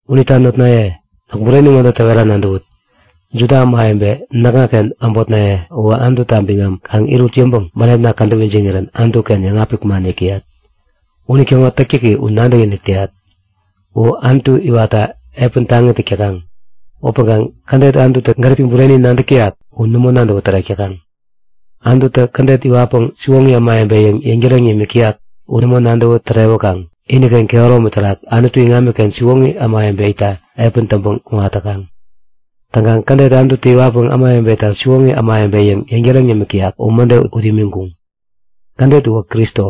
Unita notnaye, näk bureni ŋode täwera nadäwut; Juda ämawebe, näkŋaken äbotnaye uwä Anututa biŋam kaŋ irut yäŋpäŋ bänepna kädäp ijiŋirän Anutu-ken yäŋapik man yäk täyat. Unitäŋo täktäki u nadäkinik täyat. U Anutu iwatta epäni taŋi täk täkaŋ upäŋkaŋ kädet Anututä gäripi bureni nadäk täyak u nämo nadäwä tärek täkaŋ. Anututä kädet iwatpäŋ siwoŋi ämawebe yäŋ yäŋtäreŋ nimik täyak u nämo nadäwä tärewäkaŋ iniken kehäromi terak Anutu iŋamiken siwoŋi ämawebe itta epäni täŋpäŋ kuŋatkuŋ. Täŋkaŋ kädet Anututä iwatpäŋ ämawebeta siwoŋi ämawebe yäŋ yäŋtäreŋ yämik täyak u mäde ut imiŋkuŋ. Kädet uwä Kristo.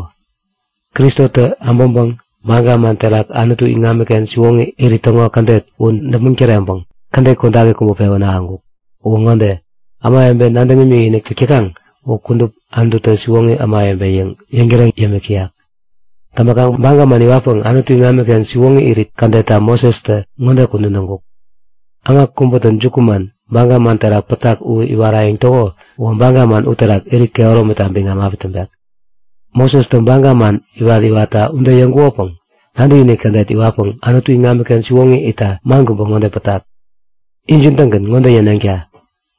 Kristotä äbäŋpäŋ baga man terak Anutu iŋamiken siwoŋi irit täŋo kädet u däpmäŋ täreŋpäŋ kädet kodaki kubä pewän ahäŋkuk. Uwä ŋode; Ämawebe nadäŋ imikinik täk täkaŋ u kudup Anututä siwoŋi ämawebe yäŋ yäŋtäreŋ yämik täyak. Täŋpäkaŋ baga man iwatpäŋ Anutu iŋamiken siwoŋi irit kädetta Mosestä ŋode kudän täŋkuk; Äma kubätä jukuman baga man terak pätak u iwarayäŋ täko uwä baga uterak irit kehäromita biŋam api täŋpek. Mosestä baga man iwat-iwatta ude yäŋkukopäŋ nadäkinik kädet iwatpäŋ Anutu iŋamiken siwoŋi itta man kubä ŋode pätak; Injin-tägän ŋode yäneŋta;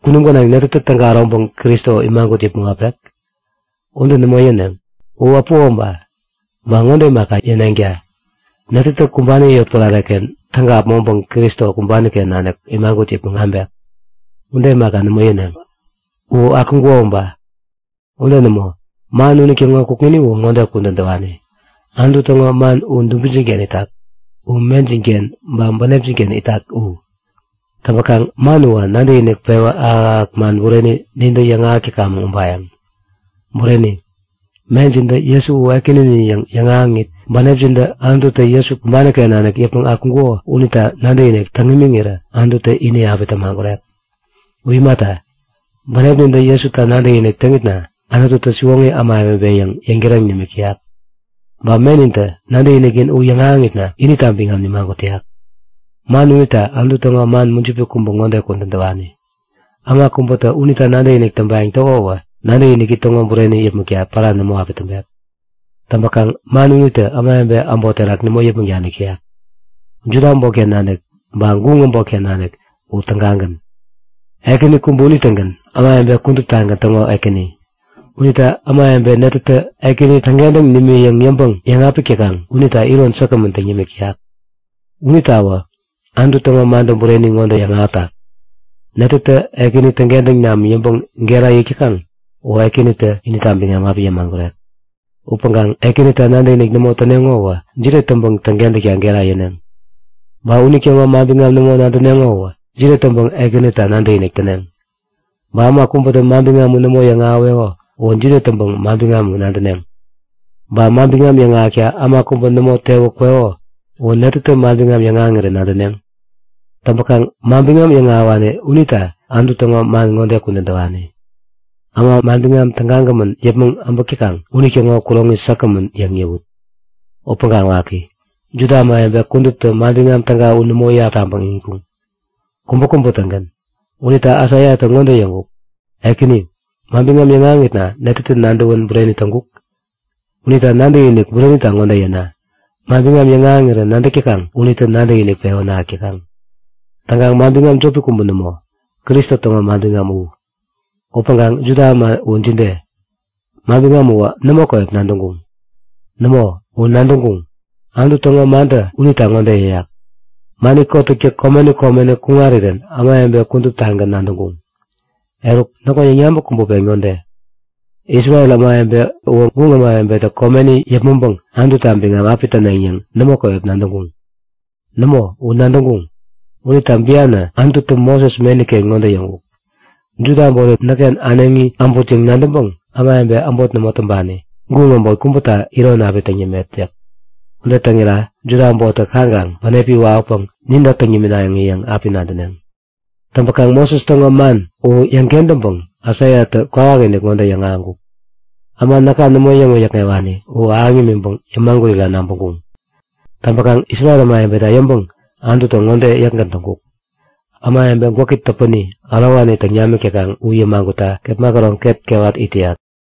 Kunum gänaŋ netätä täga äroŋpäŋ Kristo imagut yäpmäŋ äpek? Ude nämo yäneŋ! U äpuko uba! Ba ŋode imaka yäneŋta; Netätä kumbani yotpärare-ken täga äpmoŋpäŋ Kristo kumbani-ken nanik imagut yäpmäŋ abek? Ude imaka, nämo yäneŋ. U akuŋkuko uba! Ude nämo, man unitäŋo kukŋini u ŋode kudän täwani; Anutu täŋo man u dubinjin-ken itak. U mejin-ken ba bänepjin-ken itak u. Täŋpäkaŋ man uwä nadäkinik pewä ahäk-ahäk man bureni nintä yäŋahäk täkamäŋ ubayäŋ. Bureni, mejintä Jesu u Ekäninin yäŋ yäŋahäŋit, bänepjintä Anututä Jesu kumbani-ken nanik yäpmäŋ akuŋkuko unita nadäkinik täŋ imiŋirä Anututä ini api tämagurek. U imata, bänepnintä Jesuta nadäkinik täŋitna Anututä siwoŋi ämawebe yäŋ yäŋtäreŋ nimik täyak, ba menintä nadäkiniknin u yäŋahäŋitna inita biŋam nimagut täyak. Man unita Anutu täŋo man mujipi kubä ŋode kudän täwani; Äma kubätä unita nadäkinik täŋpayäŋ täko uwä nadäkiniki täŋo bureni yäpmäkta pära nämo api täŋpek. Täŋpäkaŋ man unitä ämawebe äbot terak nämo yäpmäŋ danik täyak. Juda äbotken nanik ba guŋ äbotken nanik u tägagän. Ekäni kubä unitägän ämawebe kuduptagän täŋo Ekäni. Unita ämawebe netätä Ekäni täŋkentäŋ nimi yäŋ yäŋpäŋ yäŋapik täkaŋ unita iron säkgämän täŋ yämik täyak. Unitawä Anutu täŋo mantä bureni ŋode yäŋahätak; Netätä Ekäni täŋkentäŋ nam yäŋpäŋ gera yäk täkaŋ uwä Ekänitä inita biŋam api yämagurek. Upäŋkaŋ Ekänita nadäkinik nämo täneŋo uwä jide täŋpäŋ täŋkentäkta gera yäneŋ? Ba unitäŋo manbiŋam nämo nadäneŋo u jide täŋpäŋ Ekänita nadäkinik täneŋ? Ba äma kubätä manbiŋam u nämo yäŋahäweko uwä jide täŋpäŋ manbiŋam u nadäneŋ? Ba manbiŋam yäŋahäkta äma kubä nämo tewä kweko uwä netätä manbiŋam yäŋahäŋirän nadäneŋ? Täŋpäkaŋ manbiŋam yäŋahäwani unita Anutu täŋo man ŋode kudän täwani; Äma manbiŋam tägagämän yäpmäŋ äbäk täkaŋ unitäŋo kuroŋi säkgämän yäŋ yäwut! Upäŋkaŋ waki! Juda ämawebe kuduptä Manbiŋam Täga u nämo iyap taŋpäŋ iŋitkuŋ, kubäkubä-tägän. Unita Aisaiatä ŋode yäŋkuk; Ekäni, manbiŋam yäŋahäŋitna netätä nadäwän bureni täŋkuk? Unita nadäkinik burenita ŋode yäna; Manbiŋam yäŋahäŋirä nadäk täkaŋ unitä nadäkinik pewän ahäk täkaŋ. Täŋkaŋ manbiŋam jopi kubä nämo, Kristo täŋo manbiŋam u. Upäŋkaŋ Juda äma u jide? Manbiŋam uwä nämo käwep nadäŋkuŋ? Nämo, u nadäŋkuŋ! Anutu täŋo mantä unita ŋode yäyak; Mani kotäktä komeni komeni kuŋarirän ämawebe kuduptagän nadäŋkuŋ. Eruk, näkŋo yäŋyabäk kubä pen ŋode; Isrel ämawebe uwä guŋ ämawebetä komeni yäpmäŋpäŋ Anututa biŋam api täneŋ yäŋ nämo käwep nadäŋkuŋ? Nämo, u nadäŋkuŋ! Unita bianä Anututä Moses meni-ken ŋode yäŋkuk; Juda äbottä näkken äneŋi äbut yäŋ nadäŋpäŋ ämawebe äbot nämo täŋpani, guŋ äbot kubäta iron api täŋ yämet yäk. Ude täŋira Juda äbottä kaŋkaŋ bänepi wawäpäŋ ninta täŋ niminaŋi yäŋ api nadäneŋ. Täŋpäkaŋ Moses täŋo man u yäŋ-kentäŋpäŋ Aisaiatä kwawakinik ŋode yäŋahäŋkuk; Äma näka nämo yäŋ-wäyäkŋewani u ahäŋ yämiŋpäŋ yämagurira nabäŋkuŋ. Täŋpäkaŋ Isrel ämawebeta yäŋpäŋ Anututä ŋode yäkgän täŋkuk; Ämawebe gwäki täpäni ärowani täŋ namik täkaŋ u yämagutta kepma käroŋ ket kewatkaŋ it täyat.